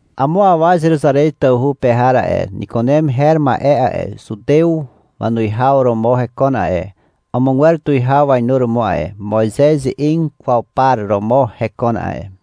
Amo awa Zeruzarez tawhu pe har a'e, Nikunem her ma'e a'e, zutew wanuwihaw romo hekon a'e, amogwer tuwihaw wainuromo a'e. Moizez ze'eg kwaw par romo hekon a'e.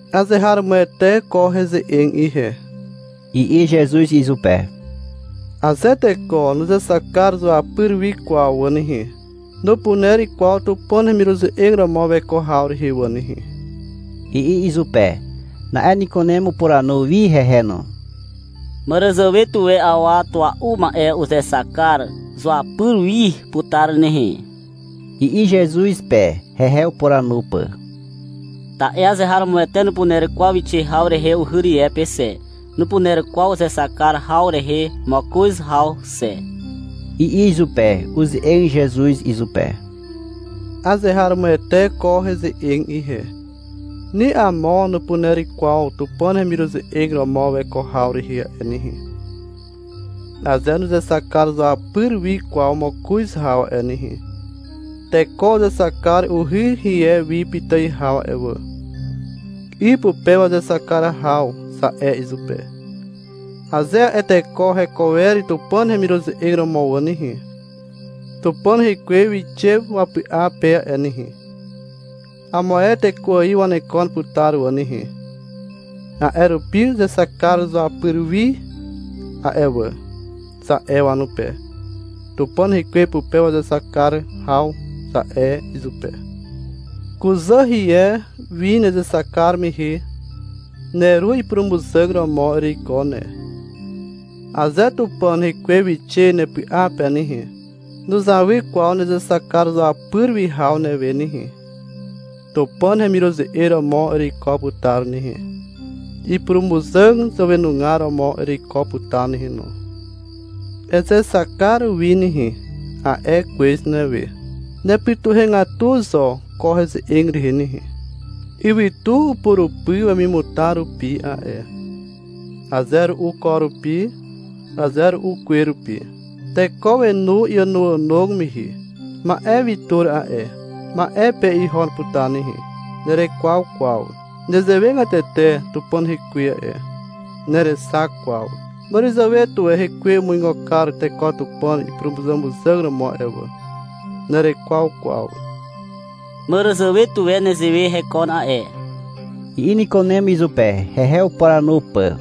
— Azeharomoete ko heze'eg ihe, i'i Zezuz izupe. — Aze teko nuzexak kar zuapyr wi kwaw wà nehe, nupuner kwaw Tupàn hemiruze'eg romo weko haw rehe wà nehe, i'i izupe. Na'e Nikunem upuranu wi hehe no. — Màràzàwe tuwe awa tua'u ma'e uzexak kar zuapyr wi putar nehe, i'i Zezuz pe, hehe upuranu pà. — Ta'e azeharomoete nupuner kwaw wixe haw rehe uhy rie pe xe, nupuner kwaw uzexak kar haw rehe mokoz haw xe, i'i izupe. Uze'eg Zezuz izupe. — Azeharomoete ko heze'eg ihe. Ni amo nupuner kwaw Tupàn hemiruze'eg romo weko haw rehe a'e nehe, aze nuzexak kar zuapyr wi kwaw mokoz haw a'e nehe. Teko uzexak kar uhy rie wi pitài haw a'e wà. — 'Y pupe wazexak kar haw, za'e izupe. Aze a'e teko heko wer Tupàn hemiruze'eg romo wà nehe, Tupàn rekwe wixe wapy'a pe a'e nehe. Amo ae teko ài wanekon putar wà nehe. A'e rupi — Uzexak kar zuapyr wi a'e wà, za'e wanupe. — Tupàn rekwe pupe wazexak kar haw, za'e izupe. Kuzà hie wi nezexak kar mehe, neru ipurumuzàg romo ereiko ne. Aze Tupàn rekwe wixe nepy'a pe nehe, nuzawy kwaw nezexak kar zuapyr wi haw newe nehe. (Tupàn hemiruze'eg romo ereiko putar nehe, ipurumuzàg zàwenugar romo ereiko putar nehe no.) — Ezexak kar wi nehe, a'e kwez newe. Nepytuhegatu zo ko heze'eg rehe nehe. Ywytu upurupy wemimutar rupi a'e, aze ru'u ko rupi, aze ru'u kwe rupi. Teko wenu iànoànog mehe. Ma'e wi tur a'e. Ma'e pe ihon putar nehe. Nerekwaw kwaw. Nezewegatete Tupàn rekwe a'e. Nerexak kwaw. Màràzàwe tuwe hekwe umuigo kar teko Tupàn ipurumuzàmuzàg romo a'e wà. Nerekwaw kwaw. — Màràzàwe tuwe nezewe hekon a'e, i'i Nikunem izupe, hehe upuranu pà.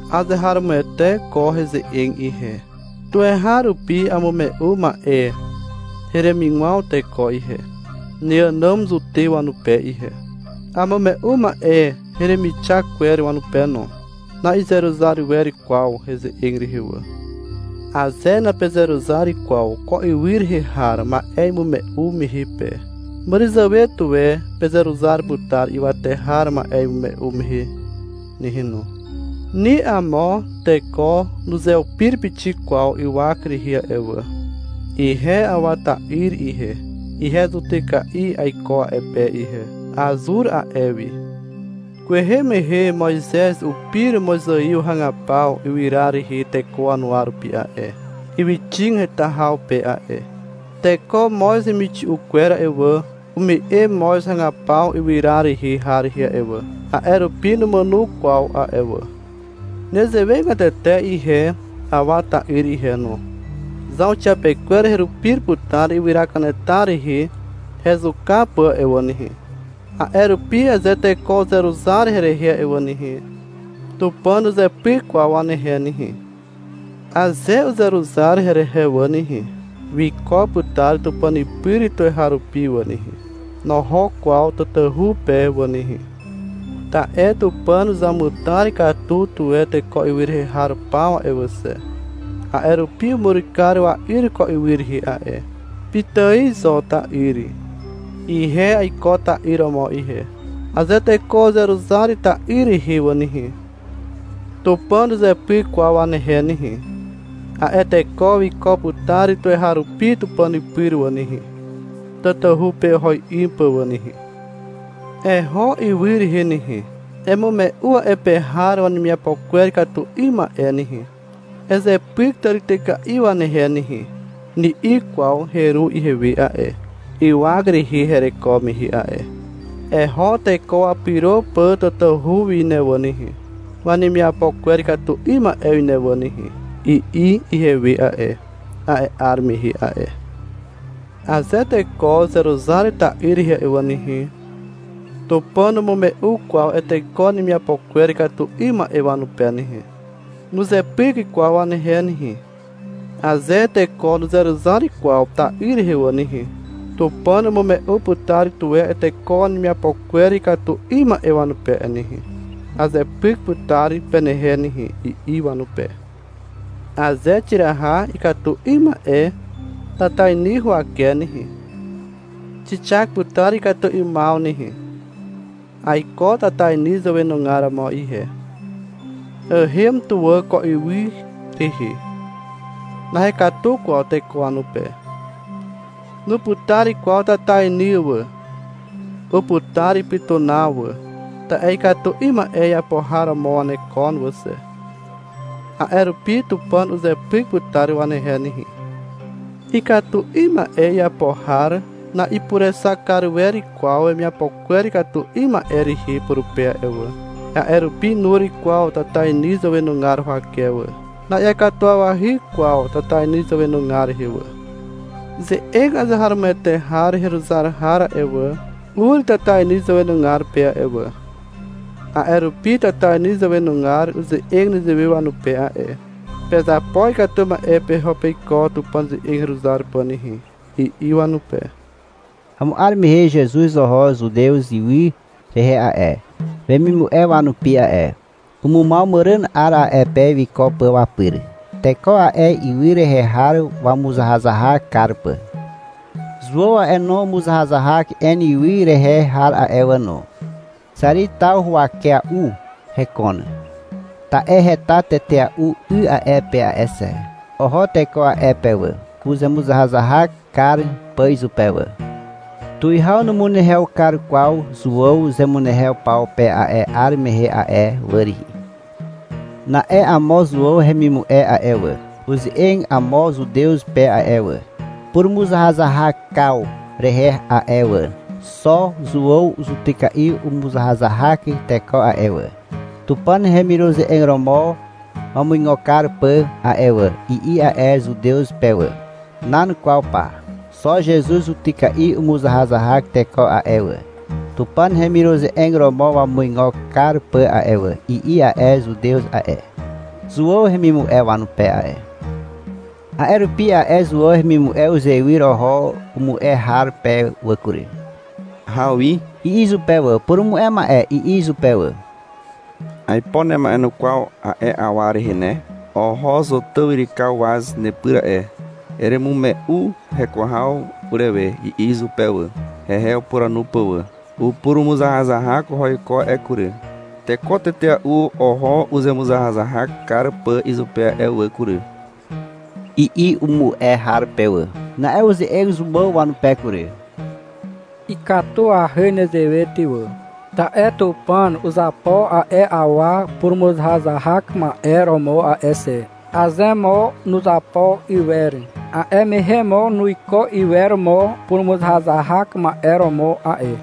Azeharomoete ko heze'eg ihe. Tuweharupi amume'u ma'e heremigwaw teko ihe, neànàm Zutew wanupe ihe. Amume'u ma'e heremixak kwer wanupe no. Na'izeruzar wer kwaw heze'eg rehe wà. Aze napezeruzar kwaw ko ywy rehe har ma'e imume'u mehe pe, màràzàwe tuwe pezeruzar putar ywate har ma'e imume'u mehe nehe no. Ni amo teko nuzeupir pixik kwaw ywak rehe a'e wà. Ihe Awa ta'yr ihe, ihe zutyka'i aiko a'e pe ihe. Azur a'e wi. Kwehe mehe Moizez upir mozaiw hagapaw ywyra rehe teko wanuwa rupi a'e, ywyxig heta haw pe a'e. Teko moz hemixi'u kwer a'e wà, ume'e moz hagapaw ywyra rehe har rehe a'e wà, a'e rupi numàno kwaw a'e wà. Nezewegatete ihe Awa ta'yr ihe no. Zauxiapekwer herupir putar ywyra kanetar rehe hezuka pà a'e wà nehe. A'e rupi aze teko uzeruzar herehe a'e wà nehe, Tupàn nuzepyk kwaw wanehe nehe. Aze uzeruzar herehe wà nehe, wiko putar (Tupàn pyr) tuweharupi wà nehe. (Noho kwaw tatahu pe wà nehe.) Ta'e Tupàn uzamutar katu tuwe teko ywy rehe har paw a'e wà xe. A'e rupi umur kar wa'yr ko ywy rehe a'e. Pitài zo ta'yr. (Ihe aiko ta'yr romo ihe.) Aze teko uzeruzar ta'yr rehe wà nehe, Tupàn nuzepyk kwaw wanehe nehe. A'e teko wiko putar tuweharupi (Tupàn pyr) wà nehe (tatahu pe oho 'ym pà wà nehe). — Eho ywy rehe nehe, emume'u a'e pe har wanemiapo kwer ikatu 'ym ma'e nehe, ezepyk tàrityka'i wanehe nehe, ni'i kwaw heru ihewe a'e, ywak rehe hereko mehe a'e. — Eho teko wapyro pà tatahu wi ne wà nehe, wanemiapo kwer ikatu 'ym ma'e wi ne wà nehe, i'i ihewe a'e, a'e 'ar mehe a'e. Aze teko uzeruzar ta'yr rehe a'e wà nehe, Tupàn numume'u kwaw a'e teko wanemiapo kwer ikatu 'ym ma'e wanupe nehe, nuzepyk kwaw wanehe nehe. Aze teko nuzeruzar kwaw ta'yr rehe wà nehe, Tupàn umume'u putar tuwe a'e teko wanemiapo kwer ikatu 'ym ma'e wanupe a'e nehe. — Azepyk putar penehe nehe, i'i wanupe. Aze xiraha ikatu 'ym ma'e tatainy huwake nehe, xixak putar ikatu 'ymaw nehe. Aiko tatainy zàwenugar romo ihe. Ahem tuwà ko ywy rehe. Nahekatu kwaw teko wanupe. Nuputar kwaw tatainy wà. Uputar ipytunaw wà, ta'e ikatu 'ym ma'e iapo har romo wanekon wà xe. A'e rupi Tupàn uzepyk putar wanehe nehe. Ikatu 'ym ma'e iapo har na'ipurexak kar wer kwaw wemiapo kwer ikatu 'ym ma'e rehe purupe a'e wà. A'e rupi nur kwaw tatainy zàwenugar huwake wà. Na'iakatuwawahy kwaw tatainy zàwenugar rehe wà. Ze'eg azeharomoete har heruzar har a'e wà, ur tatainy zàwenugar pe a'e wà. A'e rupi tatainy zàwenugar uze'eg nezewe wanupe a'e. — Pezapo ikatu ma'e peho peiko Tupàn ze'eg heruzar pà nehe, i'i wanupe. Amo 'ar mehe Zezuz oho Zutez ywy rehe a'e, wemimu'e wanupi a'e. Umumaw màràn 'ar a'e pe wiko pà wapyr, teko a'e ywy rehe har wamuzahazahak kar pà. Zuàw a'e no, umuzahazahak En ywy rehe har a'e wà no. Xàri taw huwakea'u hekon. Ta'e heta tetea'u 'y a'e pe a'e xe. Oho teko a'e pe wà, uzemuzahazahak kar pà izupe wà. (Tuwihaw numunehew kar kwaw Zuàw zemunehew paw pe a'e 'ar mehe a'e wà rihi). Na'e amo Zuàw hemimu'e a'e wà, uze'eg amo Zutew pe a'e wà, purumuzahazahakaw rehe a'e wà. — Xo Zuàw zutyka'i umuzahazahak teko a'e wà, Tupàn hemiruze'eg romo wamuigo kar pà a'e wà, i'i a'e Zutew pe wà. — Nan kwaw pa, xo Zezuz zutyka'i umuzahazahak teko a'e wà, Tupàn hemiruze'eg romo wamuigo kar pà a'e wà, i'i a'e Zutew a'e, Zuàw hemimu'e wanupe a'e. A'e rupi a'e Zuàw hemimu'e uzewyr oho umu'e har pe wà kury. — Hawi, i'i izupe wà. (— Purumu'e ma'e, i'i izupe wà.) — Aipo nema'enukwaw a'e awa rehe ne. Oho Zotàw yrykaw waz nepyr a'e. Eremume'u heko haw urewe, i'i izupe wà, hehe upuranu pà wà. — Upurumuzahazahak oho iko a'e kury. Teko tetea'u oho uzemuzahazahak kar pà izupe a'e wà kury, i'i umu'e har pe wà. Na'e uze'eg Zuàw wanupe kury. — Ikatuahy nezewe ty wà. Ta'e Tupàn uzapo a'e awa purumuzahazahak ma'e romo a'e xe. Aze mo nuzapo iwer, a'e mehe mo nuiko iwer mo purumuzahazahak ma'e romo a'e.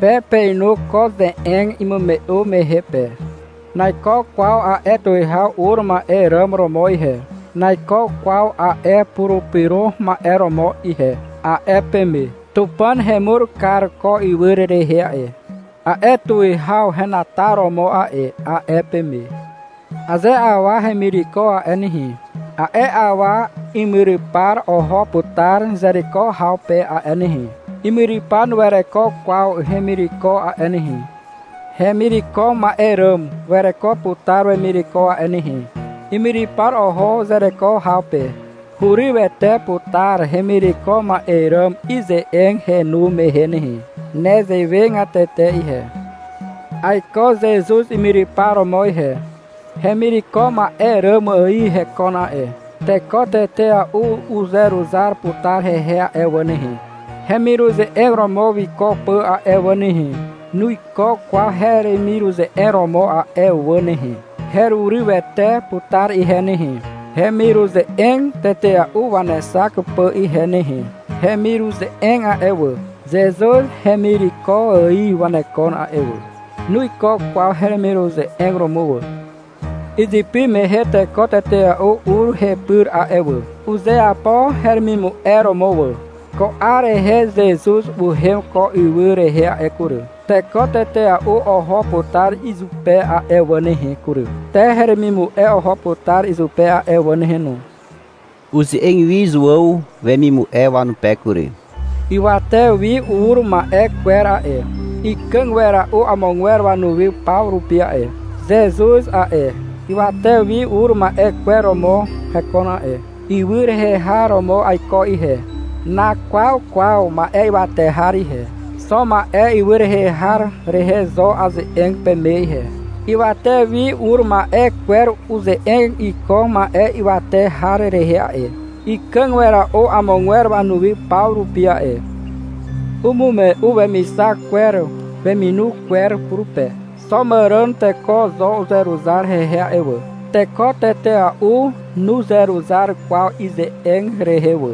Pe peinu ko ze'eg imume'u mehe pe. — Naiko kwaw a'e tuwihaw ur ma'e ràm romo ihe, naiko kwaw a'e Purupyro Ma'e romo ihe, a'e peme. — Tupàn hemur kar ko ywy rehe a'e, a'e tuwihaw henataromo a'e, a'e peme. Aze awa hemireko a'e nehe, a'e awa imyrypar oho putar zereko haw pe a'e nehe. Imyrypar nuwereko kwaw hemireko a'e nehe. Hemireko ma'e ràm wereko putar wemireko a'e nehe. Imyrypar oho zereko haw pe. Hurywete putar hemireko ma'e ràm ize'eg henu mehe nehe. Nezewegatete ihe. Aiko Zezuz imyrypar romo ihe. Hemireko ma'e ràm ài hekon a'e. Teko tetea'u uzeruzar putar hehe a'e wà nehe, hemiruze'eg romo wiko pà a'e wà nehe. Nuiko kwaw heremiruze'eg romo a'e wà nehe. Herurywete putar ihe nehe, hemiruze'eg tetea'u wanexak pà ihe nehe. Hemiruze'eg a'e wà, Zezuz hemireko ài wanekon a'e wà. Nuiko kwaw heremiruze'eg romo wà. Izypy mehe teko tetea'u ur hepyr a'e wà. Uzeapo heremimu'e romo wà. Ko 'ar rehe Zezuz uhem ko ywy rehe a'e kury. Teko tetea'u oho putar izupe a'e wà nehe kury. Te heremimu'e oho putar izupe a'e wà nehe no. Uze'eg wi Zuàw wemimu'e wanupe kury. — Ywate wi ur ma'e kwer a'e, ikàg wera'u amogwer wanuwi paw rupi a'e. Zezuz a'e, ywate wi ur ma'e kwer romo hekon a'e. Ywy rehe har romo aiko ihe. Nakwaw kwaw ma'e ywate har ihe. Xo ma'e ywy rehe har rehe zo aze'eg peme ihe. Ywate wi ur ma'e kwer uze'eg iko ma'e ywate har rehe a'e. Ikàg wera'u amogwer wanuwi paw rupi a'e. Umume'u wemixak kwer weminu kwer purupe. Xo màràn teko zo uzeruzar hehe a'e wà. Teko tetea'u nuzeruzar kwaw ize'eg rehe wà.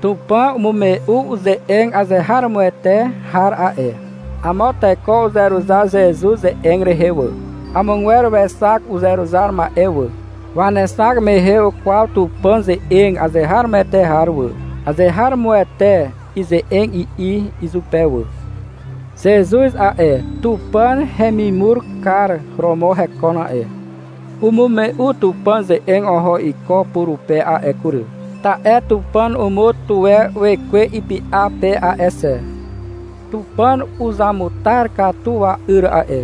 Tupàn umume'u ze'eg azeharomoete har a'e. Amo teko uzeruzar Zezuz ze'eg rehe wà. Amogwer wexak uzeruzar ma'e wà. Wanexak mehe ukwaw Tupàn ze'eg azeharomoete har wà. — Azeharomoete ize'eg, i'i izupe wà. Zezuz a'e, Tupàn hemimur kar romo hekon a'e. Umume'u Tupàn ze'eg oho iko purupe a'e kury, ta'e Tupàn umur tuwe wekwe ipy'a pe a'e xe. Tupàn uzamutar katu wa'yr a'e.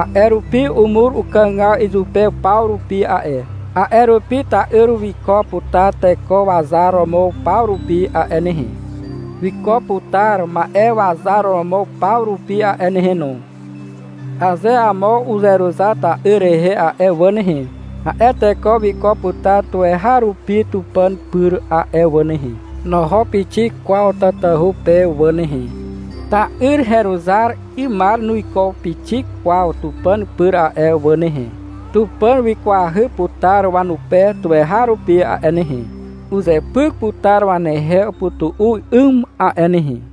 A'e rupi umur ukàgaw izupe paw rupi a'e. A'e rupi ta'yr wiko putar teko wazar romo paw rupi a'e nehe. Wiko putar ma'e wazar romo paw rupi a'e nehe no. Aze amo uzeruzar ta'yr rehe a'e wà nehe, a'e teko wiko putar tuweharupi (Tupàn pyr) a'e wà nehe. (Noho pixik kwaw tatahu pe wà nehe.) Ta'yr heruzar 'ymar nuiko pixik kwaw Tupàn pyr a'e wà nehe. Tupàn wikwahy putar wanupe tuweharupi a'e nehe, uzepyk putar wanehe upytu'u 'ym a'e nehe.